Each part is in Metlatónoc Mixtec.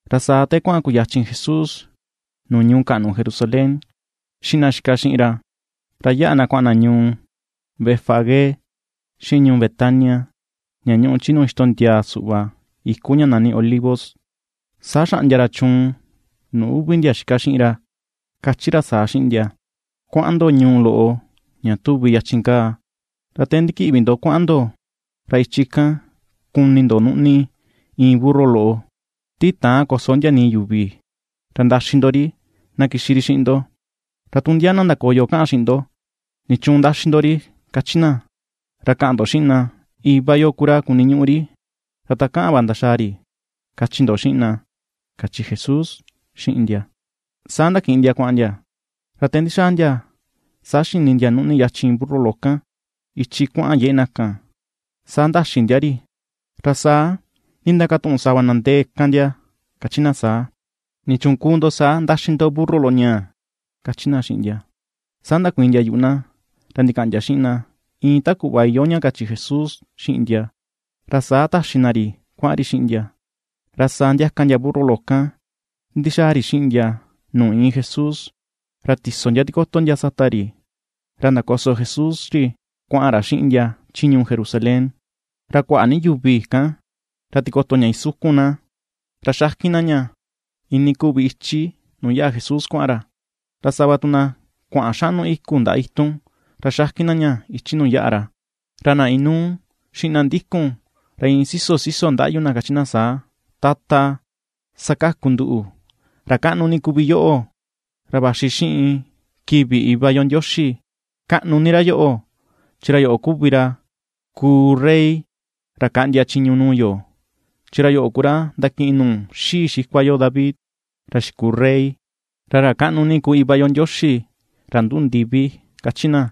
Ra saa te kuaꞌan kuyachin Jesús nuu ñuu kaꞌnu Jerusalén xiꞌin na xika xiꞌin ra, ra yaꞌa na kuaꞌan na ñuu Betfagé, xiꞌin ñuu Betania ña ñuꞌu chi nuu ixtondiaa suꞌva iku ña nani Olivo, saa xaꞌndia ra chuun nuu uvi ndia xika xiꞌin ra, kachi ra saa xiꞌin ndia: ―Kuaꞌan ndo ñuu loꞌo ña tuvi yachin kaa, ra te ndikiꞌvi ndo kuaꞌan ndo ra ichi kan, kuni ndo nuꞌni iin burru loꞌo, ti täan koso ndia nii yuvi, ra ndaxi ndo ri na kixi ri xiꞌin ndo. Ra tu ndia na ndakoyo kaꞌan xiꞌin ndo: “¿Nichuun ndaxi ndo ri?” kachi na, ra kaꞌan ndo xiꞌin na: “Iva yo ku ra kuniñuꞌu ri, ra takaꞌan va ndaxaa ri”, kachi ndo xiꞌin na ―kachi Jesús xiꞌin ndia. Saa ndakiꞌin ndia kuaꞌan ndia, ra te ndixaa ndia, saa xini ndia nuꞌni yachin burru loꞌo kan, ichi kuaꞌan yeꞌe na kan, saa ndaxi ndia ri. Ra saa ndindakatuꞌun sava na ndee kan ndia kachi na saa: ―¿Nichuun kuu ndo saa ndaxi ndo burru loꞌo ñaa? ―kachi na xiꞌin ndia. Saa ndakuiin ndia yuꞌu na, ra ndikaꞌan ndia xiꞌin na iin ta kuꞌva iyoo ña kachi Jesús xiꞌin ndia, ra saa taxi na ri kuaꞌan ri xiꞌin ndia. Ra saa ndiaka ndia burru loꞌo kan ndixaa ri xiꞌin ndia nuu iin Jesús, ra ti̱so ndia tikoto ndia sata ri, ra ndakoso Jesús ri kuaꞌan ra xiꞌin ndia chi ñuu Jerusalén. Ra kuaꞌa ni yuvi kan ra tikoto ña isukun na, ra xakin na ña iinii kuvi ichi nuu yaꞌa Jesús kuaꞌan ra, ra sava tu na kuaꞌan xaꞌnu i̱ku̱ ndaꞌa itun ra xakin na ña ichi nuu yaꞌa ra. Ra na inuu xiꞌin na ndikun, ra iin siso siso ndaꞌyu na kachi na saa: ―¡Tata, sakaku nduꞌu! ¡Ra kaꞌnu ni kuvi yoꞌo ra vaxi xiꞌin kivi Iva yo Ndioxi! Kaꞌnu ni ra yoꞌo, chin ra yoꞌo kuvi ra kuu rey ra kaꞌndia chiñu nuu yo, chi ra yoꞌo ku ra ndakiꞌin nuu xii xikua yo David, ra xikuu rey, ra ra kaꞌnu ni ku Iva yo Ndioxi ra nduꞌu ndivi ―kachi na.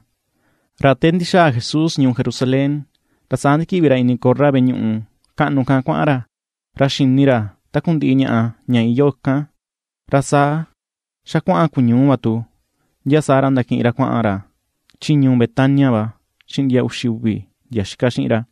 Ra te ndixaa Jesús ñuu Jerusalén, ra saa ndikiꞌvi ra ini korra veꞌe ñuꞌu kaꞌnu kan kuaꞌan ra. Ra xini ra takundiꞌi ñaꞌa ña iyoo ikan, ra saa xa kuaꞌan kuñuu va tu, ndia saa ra, ndakiꞌin ra kuaꞌan ra chi ñuu Betania va xiꞌin ndia uxi uvi ndia xika xiꞌin ra.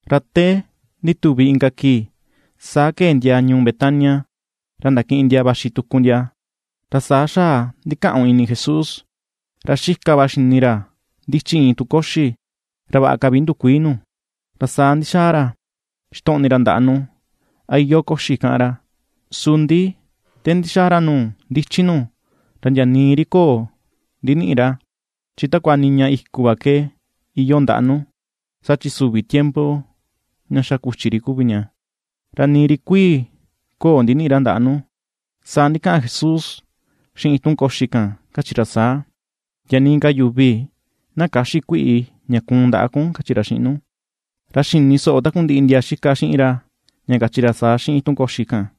Ra te ndituvi inka kii, saa kee ndia ñuu Betania ra ndakiꞌin ndia vaxi tuku ndia, ra saa xaꞌa ndikaꞌun ini Jesús. Ra xika va xini ra ndichi iin itun koxi, ra vaꞌa ka vi ndukuii nu. Ra saa ndixaꞌan ra ixtoꞌni ra ndaꞌa nu, a iyoo koxi kaꞌan ra; su ndi te ndixaa ra nuu ndichi nu, ra ndia nii ri köo ndiniꞌi ra, chin takua niña i̱ku̱ va ke iyoo ndaꞌa nu, saa chi süvi tiempo ña xa ku̱chi ri kuvi ña, ra nii ri kuii̱ köo ndiniꞌi ra ndaꞌa nu. Saa ndikaꞌan Jesús xiꞌin itun koxi kan, kachi ra saa: ―Ndia nii ka yuvi na käxi kuiꞌi ña kuun ndaꞌa kun ―kachi ra xiꞌin nu. Ra xini soꞌo takundiꞌi ndia xika xiꞌin ra, ña kachi ra saa xiꞌin itun koxi kan.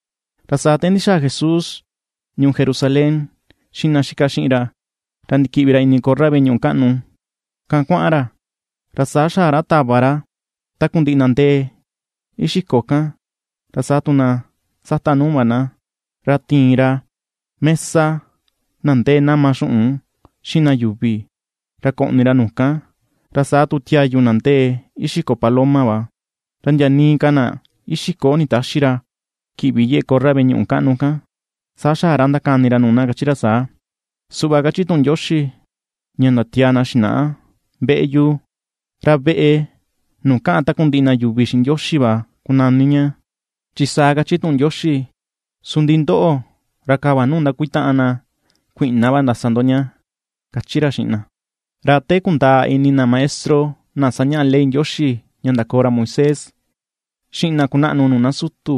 Ra saa te ndixaa Jesús ñuu Jerusalén xiꞌin na xika xiꞌin ra, ra ndikiꞌvi ra ini korra veꞌe ñuꞌu kaꞌnu kan kuaꞌan ra. Ra saa xaꞌa ra tava ra takundiꞌi na ndee ixiko kan ra saa tu na sata nuu va na, ra tiin ra mesa na ndee nama xuꞌun xiꞌin na yuvi, ra koꞌni ra nu kan, ra saa tu tiayu na ndee ixiko paloma va. Ra ndia nii ka na ixiko nditäxi ra kiꞌvi yeꞌe korra veꞌe ñuꞌu kaꞌnu kan. Saa xaꞌa ra ndakani ra nuu na kachi ra saa: ―Suꞌva kachi tuꞌun Ndioxi ña ndatiaa na xinaꞌa: “Veꞌe yu, ra veꞌe nuu kaꞌan takundiꞌi na yuvi xiꞌin Ndioxi va kunani ña.” Chin saa kachi tuꞌun Ndioxi. Su ndi ndoꞌo ra kava nuu ndakuitaꞌan na kuiꞌna va ndasa ndo ña ―kachi ra xiꞌin na. Ra te kundaa ini na maestro na sañaꞌa ley Ndioxi ña ndakoo ra Moisés, xiꞌin na kunaꞌnu nuu na sutu,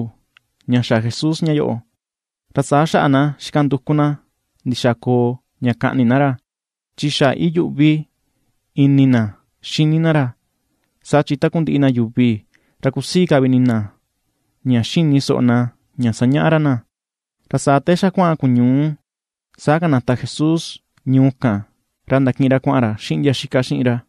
ña xa Jesús ña yoꞌo, ra saa xaꞌa na xika nduku na ndixaa koo ña kaꞌni na ra, chi xaꞌa iyuꞌvi ini na xini na ra, saa chin takundiꞌi na yuvi ra kusii ka vi ini na ña xini soꞌo na ña sañaꞌa ra na. Ra saa te xa kuaꞌan kuñuu, saa kanata Jesús ñuu kan ra ndakiꞌin ra kuaꞌan ra xiꞌin ndia xika xiꞌin ra.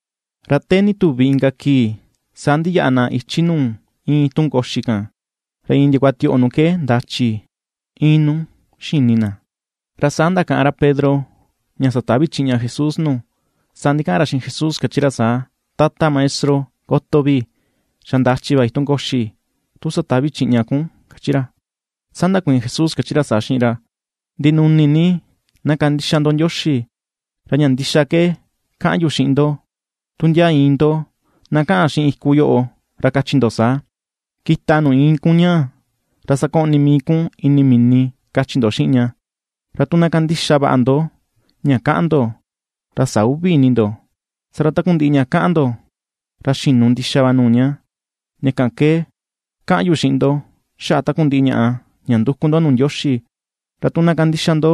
Ra te ndituvi inka kii, saa ndiyaꞌa na ichi nuu iin itun koxi kan, ra iin ndiakua tioꞌo nu ke ndachi̱ iin nu xini na. Ra saa ndakaꞌan ra Pedro ña satavi̱ chiꞌña Jesús nu, saa ndikaꞌan ra xiꞌin Jesús, kachi ra saa: ―Tata Maestro, ¡Koto vii! ¡Xa ndachi̱ va itun koxi, tu satavi̱ chiꞌña kun! ―kachi ra. Saa ndakuiin Jesús kachi ra saa xiꞌin ra: ―Ndinuni ni na kandixa ndo Ndioxi. Ra ña ndixa ke kaꞌan yu xiꞌin ndo, tu ndia iin ndo na kaꞌan xiꞌin iku yoꞌo, ra kachi ndo saa: “Kita nuu iin kun ñaa, ra sakoꞌni mii kun ini mini”, kachi ndo xiꞌin ña. Ra tu na kandixa vaꞌa ndo ña kaꞌan ndo, ra sä uvi ini ndo, saa ra, takundiꞌi ña kaꞌan ndo, ra xinu ndixa va nuu ña. Ña kan ke kaꞌan yu xiꞌin ndo, xaꞌa takundiꞌi ñaꞌa ña nduku ndo nuu Ndioxi, ra tu na kandixa ndo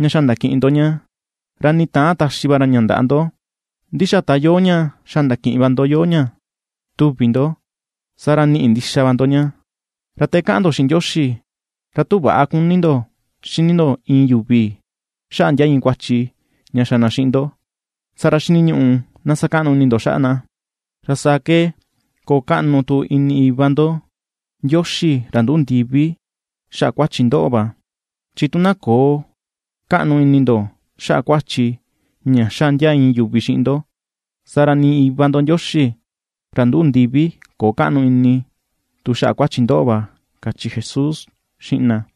ña xa ndakiꞌin ndo ña, ra nii täan taxi va ra ña ndaꞌa ndo, ndi xa ta iyoo ña xa ndakiꞌin va ndo iyoo ña tuvi ndo, saa ra ni̱ꞌi̱ ndixa va ndo ña. Ra te kaꞌan ndo xiꞌin Ndioxi, ra tu väꞌa kuni ndo xini ndo iin yuvi, xaꞌa ndia iin kuachi ña xa na xiꞌin ndo, saa ra xiniñuꞌu na sakaꞌnu ini ndo xaꞌa na. Ra saa ke koo kaꞌnu tu ini Iva ndo Ndioxi, ra ^nduꞌu ndivi, xaꞌa kuachi ndoꞌo va. Chi tu na köo kaꞌnu ini ndo xaꞌa kuachi ña xa ndia iin yuvi xiꞌin ndo, saa ra nii Iva ndo Ndioxi, ra ^nduꞌu ndivi, köo kaꞌnu ini tu xaꞌa kuachi ndoꞌo va ―kachi Jesús xiꞌin na.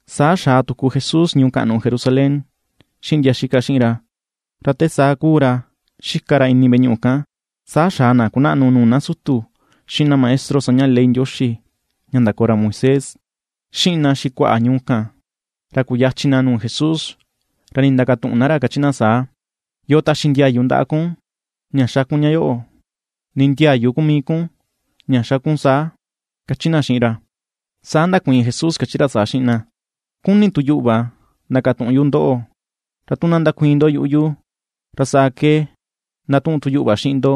Saa xaa tuku Jesús ñuu kaꞌnu Jerusalén xiꞌin ndia xika xiꞌin ra, ra te saa kuu ra xika ra ini veꞌe ñuꞌu kan, saa xaa na kunaꞌnu nuu na sutu, xiꞌin na maestro sañaꞌa ley Ndioxi ña ndakoo ra Moisés, xiꞌin na xikuaꞌa ñuu kan, ra kuyachin na nuu Jesús. Ra ndindakatuꞌun na ra, kachi na saa: ―¿Yoo taxi ndiayu ndaꞌa kun ña xa kun ña yoꞌo? ¿Ni ndiayu ku mii kun ña xa kun saa? ―kachi na xiꞌin ra. Saa ndakuiin Jesús, kachi ra saa xiꞌin na: ―Kuni̱ tu yuꞌu va ndakatuꞌun yu ndoꞌo. Ra tu na ndakuiin ndo yuꞌu yu, ra saa ke ndatuꞌun tu yuꞌu va xiꞌin ndo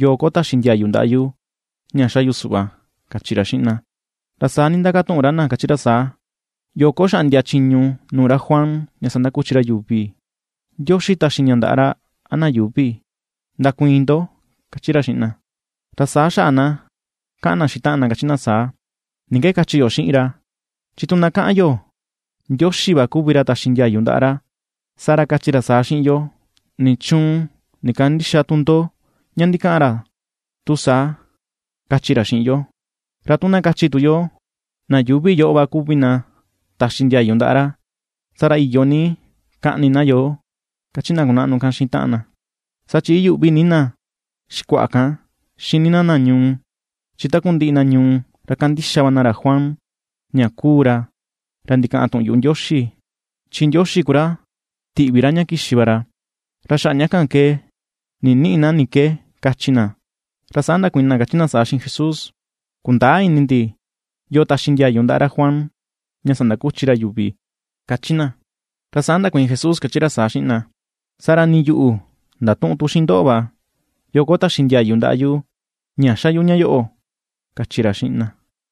yoo ko taxi ndiayu ndaꞌa yu ña xa yu suꞌva ―kachi ra xiꞌin na. Ra saa ndindakatuꞌun ra na, kachi ra saa: ―¿Yoo ko xaꞌndia chiñu nuu ra Juan ña sandakuchi ra yuvi? ¿Ndioxi taxi ña ndaꞌa ra, a na yuvi? Ndakuiin ndo. ―kachi ra xiꞌin na. Ra saa xaꞌa na kaꞌan na xiꞌin taꞌan na, kachi na saa: ―¿Ni ke kachi yo xiꞌin ra? Chi tu na kaꞌan yo: “Ndioxi va kuvi ra taxi ndiayu ndaꞌa ra”, saa ra, kachi ra saa xiꞌin yo: “¿Nichuun ndikandïxa tu ndo ña ndikaꞌan ra tu saa?”, kachi ra xiꞌin yo. Ra tu na kachi tu yo: “Na yuvi yoꞌo va kuvi na taxi ndiayu ndaꞌa ra”, saa ra, iyo ni kaꞌni na yo ―kachi na kunaꞌnu kan xiꞌin taꞌan na. Saa chin iyuꞌvi ni na xikuaꞌa kan xini na na ñuu, chi takundiꞌi na ñuu ra ^kandixa va na ra Juan ña kuu ra, ra ndikaꞌan tuꞌun yuꞌu Ndioxi, chin Ndioxi ku ra tiꞌvi ra ña kixi va ra. Ra xaꞌa ña kan ke ninïꞌi na ni ke kachi na, ra saa ndakuiin na kachi na saa xiꞌin Jesús: ―Kundäa ini ndi yoo taxi ndiayu ndaꞌa ra Juan ña sandakuchi ra yuvi ―kachi na. Ra saa ndakuiin Jesús kachi ra saa xiꞌin na: ―Saa ra nii yuꞌu ndatüꞌun tu xiꞌin ndoꞌo va, yoo ko taxi ndiayu ndaꞌa yu ña xa yu ña yoꞌo ―kachi ra xiꞌin na.